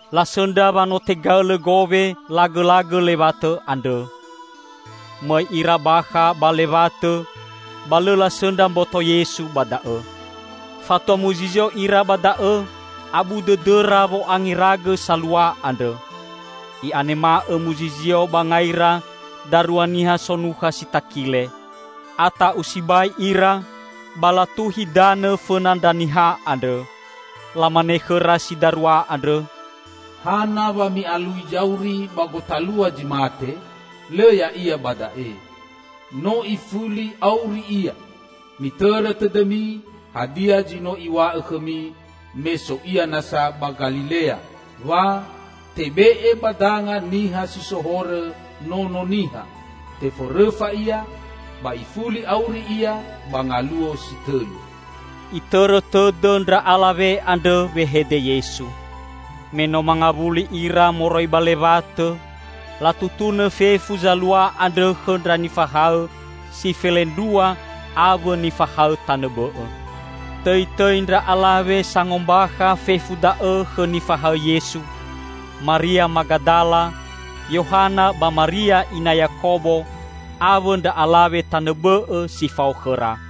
Lasõndra wa no tegaõlõ gowe lagõlagõ lewatõ andrõ. Mõi ira bakha ba lewatõ, ba lõ lasõndra mboto Yesu ba da'õ. Fatua muzizio ira ba da'õ abu dõdõra wo'angeragõ salua andrõ. I'anema'õ muzizio ba ngaira darua niha sonukha si takile. Ata'u sibai ira, ba latuhi danõ fõna ndra niha andrõ. Lamane khõra si darua andrõ, "Hana wa mi'alui zauri ba gotalua zi mate? Lõ Ya'ia ba da'e; no ifuli auri Ia! Mitõrõ tõdõmi hadia zi no Iw̃a'õ khõmi me so Ia nasa ba Galilea, wa 'Tebe'e ba danga niha si so horõ Nono Niha, teforõfa Ia, ba ifuli auri Ia ba ngaluo si tõlu.'" Itõrõ tõdõ ndra alawe andrõ wehede Yesu. Me no mangawuli ira moroi ba lewatõ, latutunõ fefu zalua andrõ khõ ndra nifahaõ si felendrua awõ nifahaõ tanõ bõ'õ. Tõitõi ndra alawe sangombakha fefu da'õ khõ nifahaõ Yesu: Maria Magadala, Yohana ba Maria ina Yakobo awõ ndra alawe tanõ bõ'õ si fao khõra.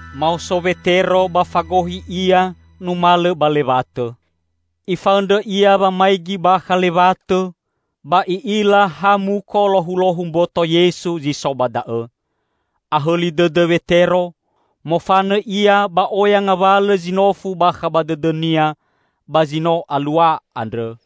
Maoso Wetero ba fagohi ia numalõ ba lewatõ. Ifaõndrõ ia wamaigi bakha lewatõ, ba i'ila ha muko lohulohu mboto Yesu zi so ba da'õ. Ahõli dõdõ Wetero, mofanõ ia ba oya ngawalõ zinofu bakha ba dõdõnia ba zi no alua andrõ.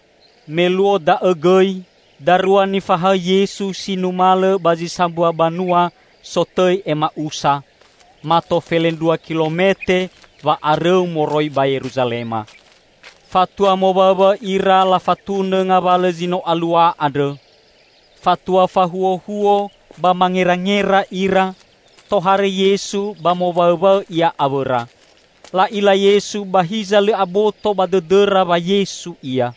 Me luo da'õ gõi, darua nifahaõ Yesu si numalõ ba zi sambua banua sotõi Ema'usa, mato felendrua kilomete wa'arõu moroi ba Yeruzalema. Fatua mowaõwaõ ira lafatunõ ngawalõ zi no alua andrõ. Fatua fahuohuo ba mangerangera ira, tohare Yesu ba mowaõwaõ Ia awõra. La'ila Yesu ba hiza lõ aboto ba dõdõra wa Yesu Ia.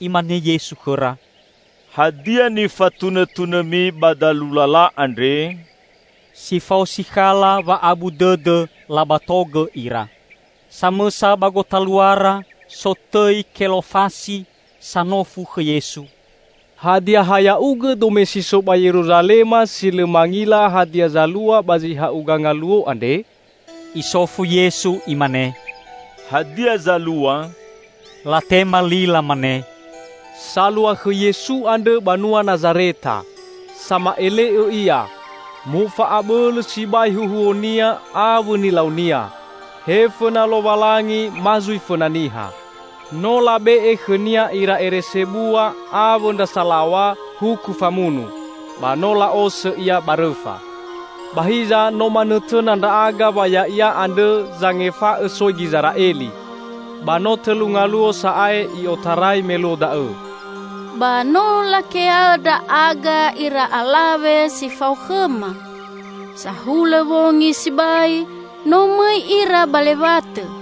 Imane Yesu khõra, "Hadia nifatunõtunõmi ba dalu lala andre?" Si fao sikhala wa'abu dõdõ labatogõ ira. Samõsa ba gotaluara sotõi Kelofasi sanofu khõ Yesu, "Hadia ha Ya'ugõ dome si so ba Yeruzalema si lõ mangila hadia zalua ba zi ha'uga ngaluo andre?" Isofu Yesu Imane, "Hadia zalua?" Latema li lamane, "Salua khõ Yesu andrõ, banua Nazareta. Sama'ele'õ Ia; mofa'abõlõ sibai huhuo-Nia awõ nilau-Nia -- he fõna Lowalangi ma zui fõna niha. No labe'e khõ-Nia ira ere sebua awõ ndra salaw̃a huku famunu, ba no la'osõ Ia ba rõfa! Ba hiza no manõtõna ndra'aga wa Ya'ia andrõ zangefa'õ soi Gizera'eli! Ba no tõlu ngaluo sa'ae i'otarai me luo da'õ. Ba no lakea'õ ndra'aga ira alawe si fao khõma. Sahulõ wongi sibai no mõi ira ba lewatõ,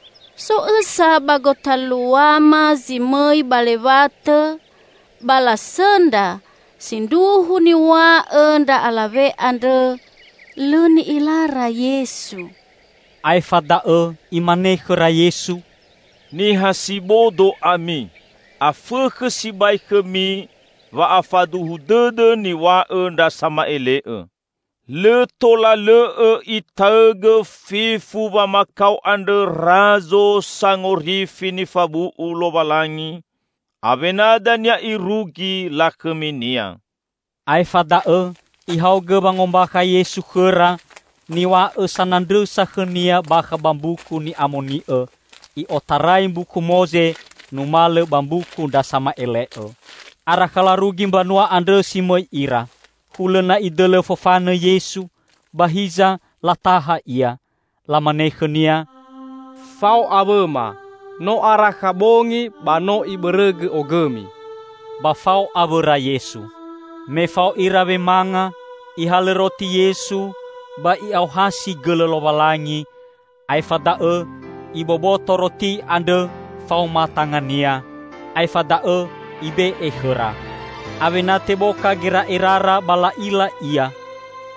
So õsa ba gotaluama zi mõi ba lewatõ ba lasõndra sindruhu niw̃a'õ ndra alawe andrõ, lõ ni'ilara Yesu." Aefa da'õ Imane khõra Yesu, "Niha si bodo ami! Afõkhõ sibai khõmi wa'afaduhu dõdõ niw̃a'õ ndra sama'ele'õ! Lõ tola lõ'õ Itaõgõ fefu wamakao andrõ Razo Sangorifi nifabu'u Lowalangi, awena dania irugi lakhõmi-Nia!" Aefa da'õ Ihaogõ wangombakha Yesu khõra niw̃a'õ sanandrõsa khõ-Nia bakha ba Mbuku Ni'amoni'õ, i'otarai Mbuku Moze numalõ ba mbuku ndra sama'ele'õ. Arakha larugi mbanua andrõ si mõi ira. Hulõ na Idõlõ fofanõ Yesu, ba hiza lataha Ia. Lamane khõ-Nia, "Fao awõma, no arakha bongi ba no ibõrõgõ ogõmi." Ba fao awõra Yesu. Me fao ira wemanga, Ihalõ roti Yesu ba I'aohasi gõlõ Lowalangi, aefa da'õ Iboboto roti andrõ faoma tanga-Nia, aefa da'õ Ibe'e khõra. Awena teboka geragerara ba la'ila Ia.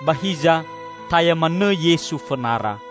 Ba hiza taya manõ Yesu fõnara.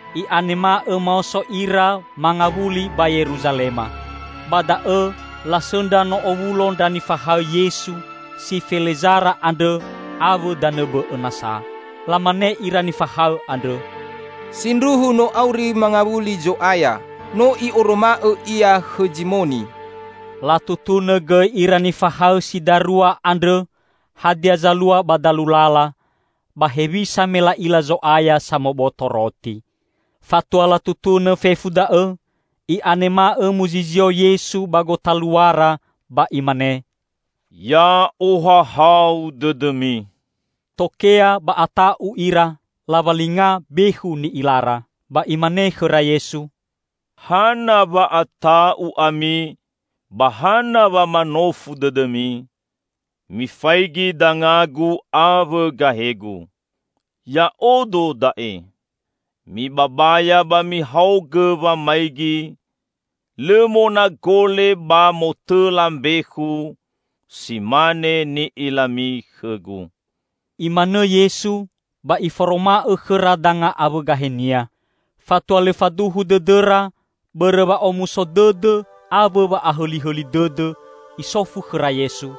I'anema'õ maoso ira mangawuli ba Yeruzalema. Ba da'õ lasõndra no owulo ndra nifahaõ Yesu si felezara andrõ awõ danõ bõ'õ nasa. Lamane ira nifahaõ andrõ, "Sindruhu no auri mangawuli Zo'aya! No I'oroma'õ Ia khõ Zimoni!" Latutunõ gõi ira nifahaõ si darua andrõ hadia zalua ba dalu lala, ba hewisa me la'ila Zo'aya samoboto roti. Fatua latutunõ fefu da'õ, i'anema'õ muzizio Yesu ba gotaluara ba Imane, "Ya'ohahau dõdõmi!" Tokea ba ata'u ira, lawalinga bekhu ni'ilara. Ba Imane khõra Yesu, "Hana wa'ata'u ami, ba hana wa manofu dõdõmi? Mifaigi danga-Gu awõ gahe-Gu. Ya'odo da'e! Mibabaya ba mihaogõ wamaigi, lõ monagole ba motõla mbekhu, si mane ni'ilami khõ-Gu." Imanõ Yesu ba Iforoma'õ khõra danga awõ gahe-Nia. Fatua lõ faduhu dõdõra bõrõ wa'omuso dõdõ awõ wa'ahõli dõdõ, Isofu khõra Yesu,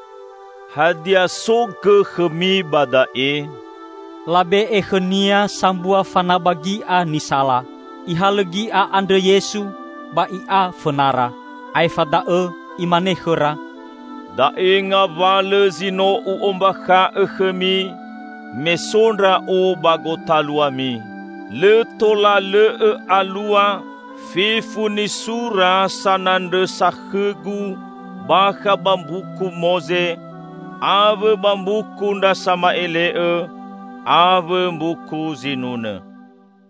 "Hadia so gõ khõmi ba da'e?" Labe'e khõ-Nia sambua fanaba gi'a nisala. Ihalõ gi'a andrõ Yesu, ba I'a fõnara. Aefa da'õ Imane khõra, "Da'e ngawalõ zi no U'ombakha'õ khõmi me so Ndra'o ba gotaluami: lõ tola lõ'õ alua fefu nisura sanandrõsa khõ-Gu bakha ba Mbuku Moze, awõ ba Mbuku ndra Sama'ele'õ, awõ Mbuku Zinunõ."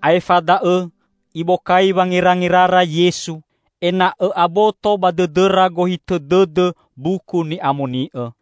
Aefa da'õ Ibokai wangerangerara Yesu ena'õ aboto ba dõdõra gohitõ dõdõ Mbuku Ni'amoni'õ.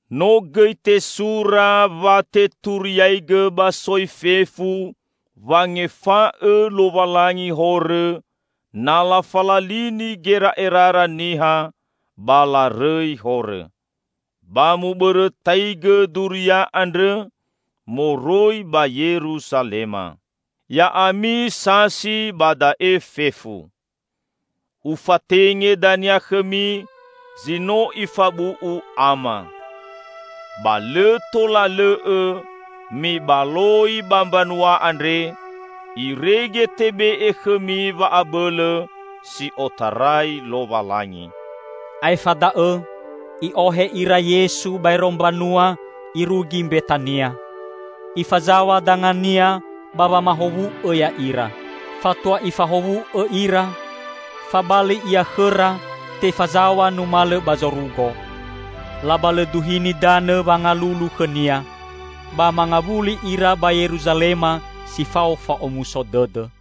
No gõi tesura wa teturiaigõ ba soi fefu wangefa'õ Lowalangi horõ, na lafalalini gera'erara niha ba larõi horõ. Ba mubõrõtaigõ duria andrõ moroi ba Yeruzalema. Ya'ami sasi ba da'e fefu. Ufatenge dania khõmi zi no Ifabu'u Ama. Ba lõ tola lõ'õ mibaloi ba mbanua andre, irege tebe'e khõmi wa'abõlõ si otarai Lowalangi." Aefa da'õ I'ohe ira Yesu baero mbanua irugi Mbetania. Ifazaw̃a danga-Nia ba wamahowu'õ ya'ira. Fatua Ifahowu'õ ira, fabali Ia khõra tefazaw̃a numalõ ba zorugo. Labalõduhini danõ wangalulu khõ-Nia, ba mangawuli ira ba Yeruzalema si fao fa'omuso dõdõ.